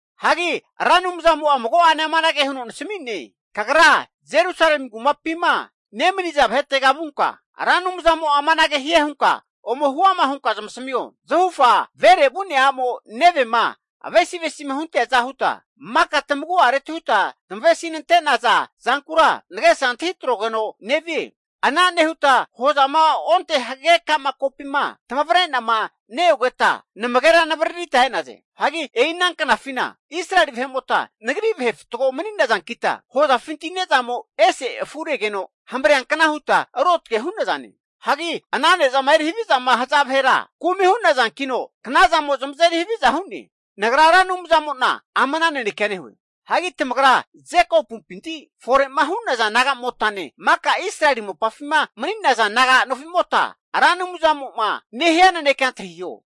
Hagi Ra Anumzamo'a mago'ane amanage huno nasami'ne, Kagra Jerusalemi kumapima nemaniza vahetega vunka, Ra Anumzamo'a amanage hie hunka ome huama hunka zamasamio. Zahufa vere vu'nea a'mo nevema avesi avesi'ma hunteaza huta, maka tamagu'areti huta tamavesi nante'naza zankura nagesa antahi atrogeno nevie. Ana nehuta hozama onte hagage ka'ma kopima tamavrenama neogeta namagera navararita e'naze. Hagi e'i ana knafina Israeli vahe'mota Nagri vahe fatgo mani'nazankita, hozafinti ne'zamo ese afu re'negeno hamreankna huta ruotge hu'nazane. Hagi ana ne'zama eri havizama haza vahera kumi hu'nazankino, knazamo zamazeri haviza hu'ne. Nagra Ra Anumzamo'na ama ana nanekea nehue. Hagi tamagra Jekopumpinti fore'ma hu'naza nagamotane maka Israeli mopafima mani'naza naga nofimota Ra Anumzamo'ma nehia nanekea antahiho.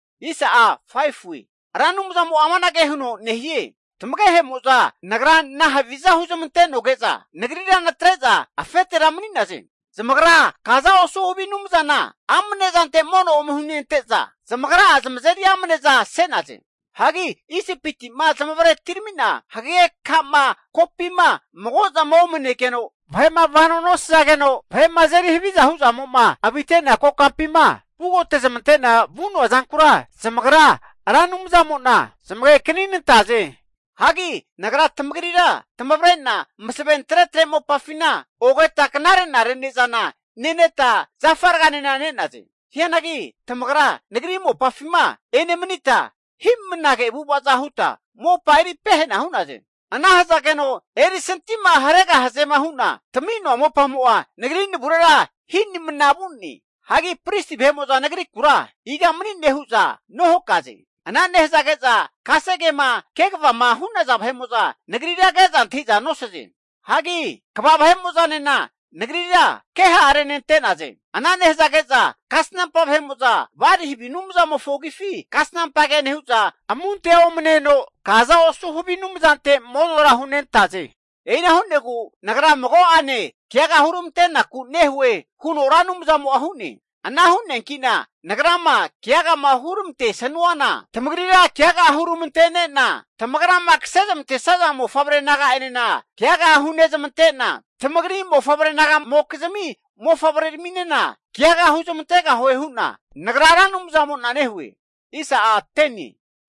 Ra Anumzamo'a amanage huno nehie, Tamagehemo'za Nagra nahaviza huzmantenoge'za nagrira natre'za afetera mani'naze? Zamagra kaza osu havi anumzana amanezante mono ome hunente'za, zamagra'a zamazeri amne'za se'naze. Hagi Isipitima zamavare atiramina hagage ka'ma kopima mago'zama omanegeno vahe'ma vanoma nosazageno vahe'ma azeri haviza huzamo'ma avite'nea kokampima vugote'zamante'na vu'noa zankura zamagra Ra Anumzamo'na zamagekaninantaze. Hagi Nagra tamagrira tamavre'na masaven tretre mopafina ogeta knare'nare ne'zana neneta zafa raganena ne'naze. Hianagi tamagra Nagri mopafima enemanita hinimnage avu'avaza huta mopa eri pehena hu'naze. Ana hazageno erisantima haregahazema hu'na tami'noa mopamo'a Nagri navurera hinimna vu'ne. Hagi pristi vahe'mo'za Nagrikura, iga mani'ne? hu'za nohakaze. Ana nehazage'za kasegema kegavama hu'naza vahe'mo'za, Nagrira ke'za antahi'za nosaze. Hagi kva vahe'mo'zanena Nagrira keha renante'naze. Ana nehazage'za kasnampa vahe'mo'za Bali havi anumzamofo agifi kasnampa ke nehu'za, amunte omaneno kaza osu havi anumzante monora hunentaze. E'ina hu'negu Nagra mago'ane keaga huramante'naku nehue huno Ra Anumzamo'a hu'ne. Ana hu'neanki'na Nagrama keagama huramantesanuana, tamagrira keaga huramantene'na, tamagrama kase zamantesaza mofavre naga'enena keaga hunezmantena, tamagri mofavre nagamokizmi mofavreraminena keaga huzmantegahue hu'na Nagra Ra Anumzamo'na nehue.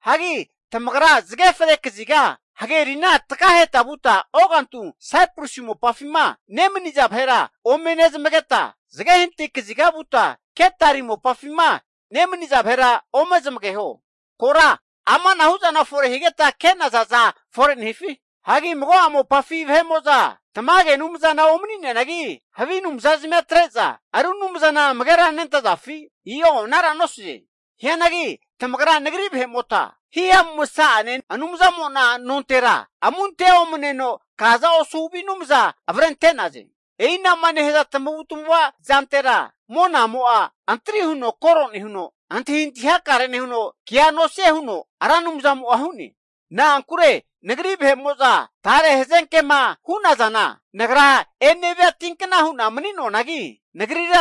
Hagi tamagra zage fre kaziga hagerina takaheta vuta ogantu Saiprusi mopafima nemaniza vahera ome nezamageta, zage hanati kaziga vuta Kedari mopafima nemaniza vahera ome zamageho. Kora amanahu zana fore higeta ke'nazaza fore nehifi? Hagi mago'a mopafi vahe'mo'za tamage anumzana omani'neanagi havi anumza zamia atre'za ru anumzana amagera nentazafi? i'o anara nosaze. Hianagi tamagra Nagri vahe'mota hihamu masa'ane Anumzamo'na nontera, amunte omaneno kaza osu havi anumza avrente'naze. E'i ana'ma nehaza tamavu tamava zantera monamo'a antri huno koro nehuno, antahintahi hakare nehuno kea nosie huno Ra Anumzamo'a hu'ne. Na'ankure Nagri vahe'mo'za tare hazenkema hu'nazana, Nagra enevia tinkna hu'na mani'noanagi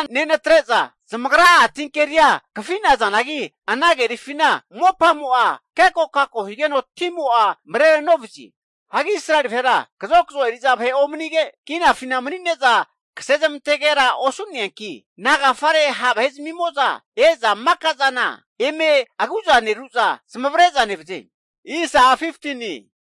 nenatre'za, zamagra'a tinkeria kafi'nazanagi ana kerifina mopamo'a kekokako higeno timo'a mare novazie. Hagi Israeli vahera kazokazo eri'za vahe omanige, kinafina manine'za kase zamantegera osu'neanki nagafare ha' vahe zamimo'za e'za maka zana eme agu'zaneru'za zamavare'za nevaze?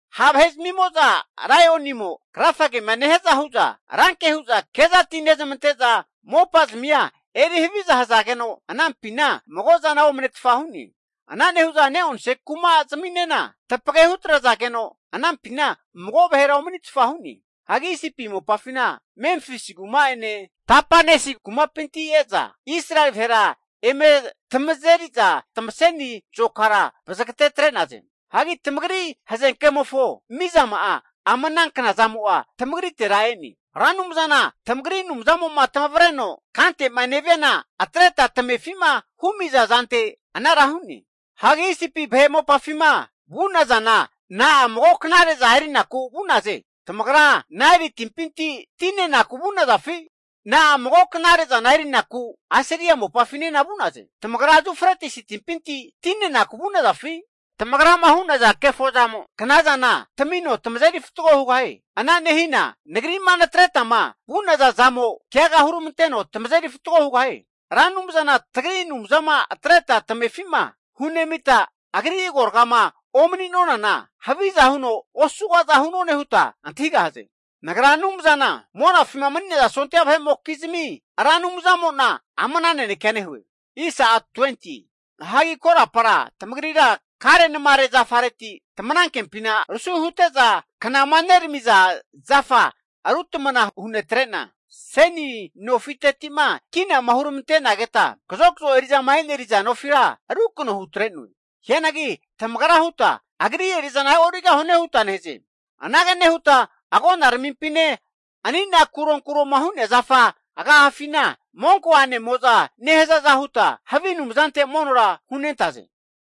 Ha' vahe zamimo'za laionimo krafagema nehiaza hu'za ranke huza kezati nezamante'za, mopazamia eri haviza hazageno anampina mago'zana omnetfa hu'ne. Ana nehu'za ne'onse kuma zaminena tapage hutrazageno anampina mago vahera omanitfa hu'ne. Hagi Isipi mopafina Memfisi kuma'ene Tapanesi kumapinti e'za Israeli vahera eme tamazeriza tamaseni zokara vazagate atre'naze. Hagi tamagri hazenkemofo mizama'a ama ana kna zamo'a tamagritera e'ne. Ra Anumzana tamagri Anumzamo'ma tamavreno kante'ma neviana atreta tamefi'ma humiza zante anara hu'naze. Hagi Isipi vahe mopafima vu'nazana na'a mago knare'za erinaku vu'naze. Tamagra Naeli timpinti ti nenaku vu'nazafi? Na'a mago knare'zana erinaku Asiria mopafinena vu'naze. Tamagra Yufretisi timpinti ti nenaku vu'nazafi? Tamagrama hu'naza kefozamo kna zana tamino tamazeri fatgo hugahie. Ana nehina Nagri'ma natretama vu'naza zamo keaga huramanteno tamazeri fatgo hugahie. Ra Anumzana tagri Anumzama atreta tamefi'ma hunemita agri agoragama omani nonana, haviza huno osugaza hu'none huta antahigahaze. Nagra Anumzana Monafima sondia vahe'mokizmi Ra Anumzamo'na ama ana nanekea nehue. Hagi korapara tamagrira karenamare zafareti tamanankempina rusi hute'za knama neramiza zafa ru tamana hunetre'na, seni nofiteti'ma kinama huramantenageta kazokazo eri'zama e'neriza nofira rukano hutre'noe. Hianagi tamagra huta Agri eri'zana e'origahune huta nehaze. Anage nehuta agonaramimpine anina kuronkuroma hu'nea zafa agafafina monko a'nemo'za nehazaza huta havi anumzantera monora hunentaze.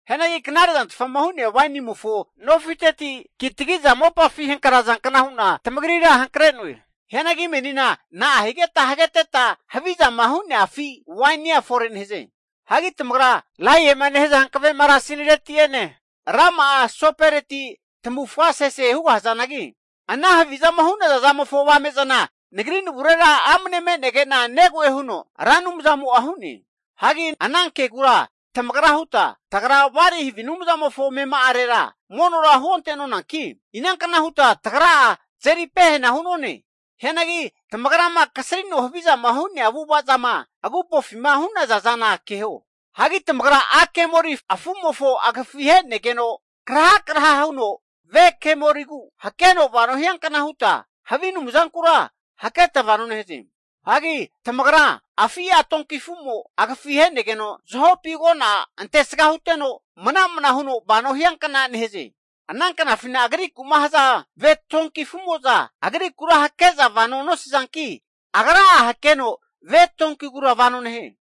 Hianagi knare zantfama hu'nea wainimofo nofiteti kitagi'za mopafi hankraza kna hu'na tamagrira hankre'noe. Hianagi menina na'a higeta hageteta havizama hu'nea afi wainia fore nehaze? Hagi tamagra laema nehaza hankave marasini reti'ene rama'a soporeti tamavufga sese hugahazanagi, ana havi zama hu'naza zamofo avame'zana Nagri navurera amne me'nege'na negoe, huno Ra Anumzamo'a hu'ne. Hagi ana kegura tamagra huta, tagra Bali havi anumzamofo amema'arera monora huonte'nonanki, inankna huta tagra'a tazeri pehena hu'none huta nehaze. Hianagi tamagrama kasrino havizama hu'nea avu'ava zama agupofima hu'naza zana keho. Hagi tamagra a' kemoli afu'mofo agifi he'negeno, krahakraha huno ve kemoligu hakeno vano hiankna huta havi anumzankura haketa vano nehaze. Hagi tamagra, afi' a' donki afu'mo agafi ahe'negeno zahopi agona antesga huteno mana'mana huno vano hiankna nehaze. Ana knafina agriku'ma haza ve tonki afu'moza agrikura hakeza vano nosazanki agra'a hakeno ve tonkigura vano nehie.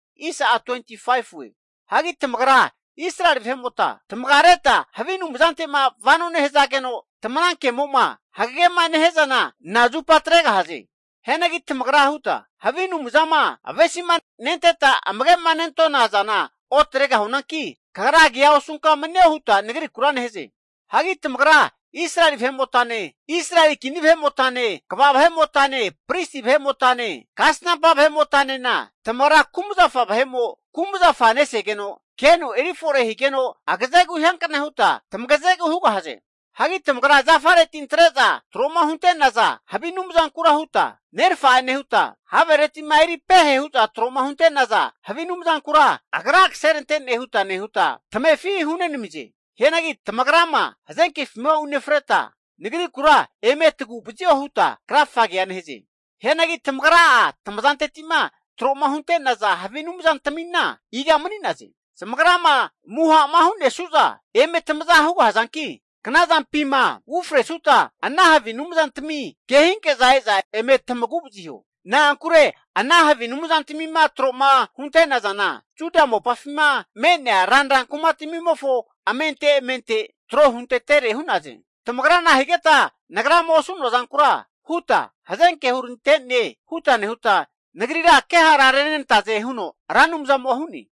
Hagi tamagra Israeli vahe'mota, tamagareta havi anumzante'ma vano nehazageno tamanankemo'ma hagagema nehia zana nazupa atregahaze? Hianagi tamagra huta, havi anumzama avesima nenteta amage'ma nentona zana otregahunanki, kagra kea osunka manio huta Nagrikura nehaze. Hagi tamagra Israeli vahe'motane, Israeli kini vahe'motane, kva vahe'motane, pristi vahe'motane, kasnampa vahe'motanena, tamagra kumzafa vahe'mo kumzafa nesageno keno eri fore higeno agazegu hiankna huta tamagazegu hugahaze. Hagi tamagra zafareti antre'za tro'ma huntenaza havi anumzankura huta nerafa'e nehuta, havere'ma eri pehe hu'za tro'ma hunte'naza havi anumzankura agra kaserantene huta nehuta tamefi hunami'naze. Hianagi tamagra'ma hazenkefima unefreta Nagrikura eme tagu'vazio huta krafagea nehaze. Hianagi tamagra'a tamazanteti'ma tro'ma hunte'naza havi anumzantamina iga mani'naze? Zamagrama muha'ma hu'nesanu'za eme tamaza hugahazanki, knazampima ufresuta ana havi anumzantami kehinke'za e'za eme tamagu vaziho. Na'ankure ana havi anumzantamima tro'ma huntenazana, Juda mopafima me'nea ranra kumatamimofo amente amente tro huntetere hu'naze. Tamagra nahigeta Nagrama osu'noa zankura huta hazenke hurante'ne huta nehuta Nagrira kehara renenantaze huno Ra Anumzamo'a hu'ne.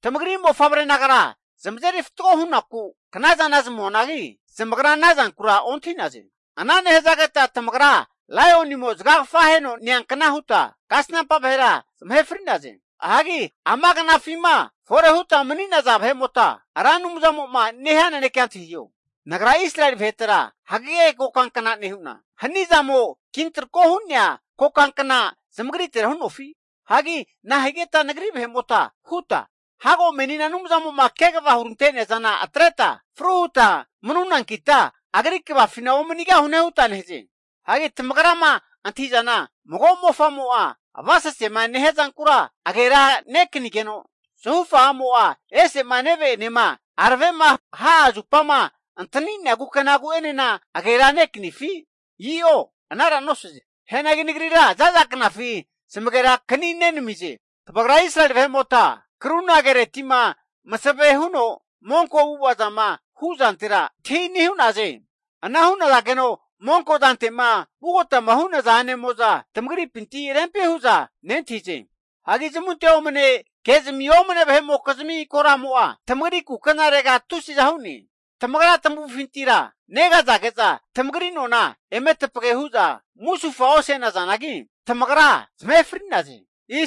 Tamagri mofavre nagara zamazeri fatgo hunaku knazana zamuanagi, zamagra ana zankura ontahi'naze. Ana nehazageta tamagra laionimo zagagafa aheno neankna huta kasnampa vahera zamahe fri'naze. Hagi ama knafima fore huta mani'naza vahe'mota Ra Anumzamo'ma nehia nanekea antahiho. Nagra Israeli vahetera hagege kokankna nehu'na, hanizamo kintrako hu'nea kokankna zamagritera hu'nofi? Hagi nahigeta Nagri vahe'mota huta, hago menina Anumzamo'ma kegavama hurante'nea zana atreta fru huta manunankita Agri kvafina omanigahune huta nehaze. Hagi tamagrama antahi'zana mago mofamo'a avasasema nehia zankura agera nekanigeno, zahufa a'mo'a ese'ma neve'enema aravema ha'a zupama antani'nea kukenagu'enena aganera nekanifi? I'o anara nosaze. Hianagi Nagrira za'za knafi zamagera kaninenamize. Tamagra Israeli vahe'mota, karuna kereti'ma masave huno monko avu'ava zama hu' zantera antahini hu'naze. Ana hu'nage'za monko zante'ma vugotama hu'naza a'nemo'za tamagripinti rempi hu'za nentahize. Hagi zamunte omaneno ke'zami omane vahe'mokizmi koramo'a tamagri kukenarega tusiza hu'ne. Tamagra tamavufintira negazage'za tamagri nona eme tapage hu'za musufa ose'nazanagi, tamagra zamahe fri'naze.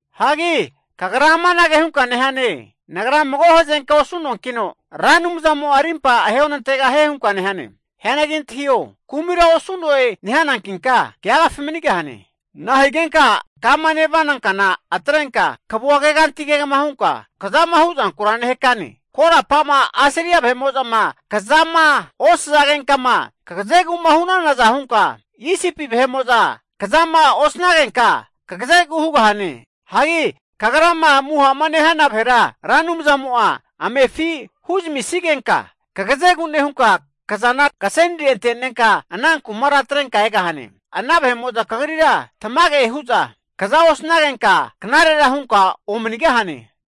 Hagi kagra amanage hunka nehane, nagra mago hazenkea osu'noankino Ra Anumzamo'a arimpa ahe onantegahie hunka nehane. Hianagi antahio, kumira osu'noe nehanankinka keagafi manigahane. Nahigenka kama nevana kana atrenka kavua keganti kegama hunka kazama huzankura nehakane? Korapa'ma Asiria vahe'mo'zama kazama osazagenkama kagazegu'ma hu'nanaza hunka, Isipi vahe'mo'za kazama osanagenka kagazegu hugahane. Hagi kagrama muha'ma nehana vahera Ra Anumzamo'a amefi huzamisigenka kagazegu nehunka kazana kasenire ante'nenka ana kumara atrenka egahane. Ana vahe'mo'za kagrira tamage hu'za kaza osanagenka knarera hunka omanigahane.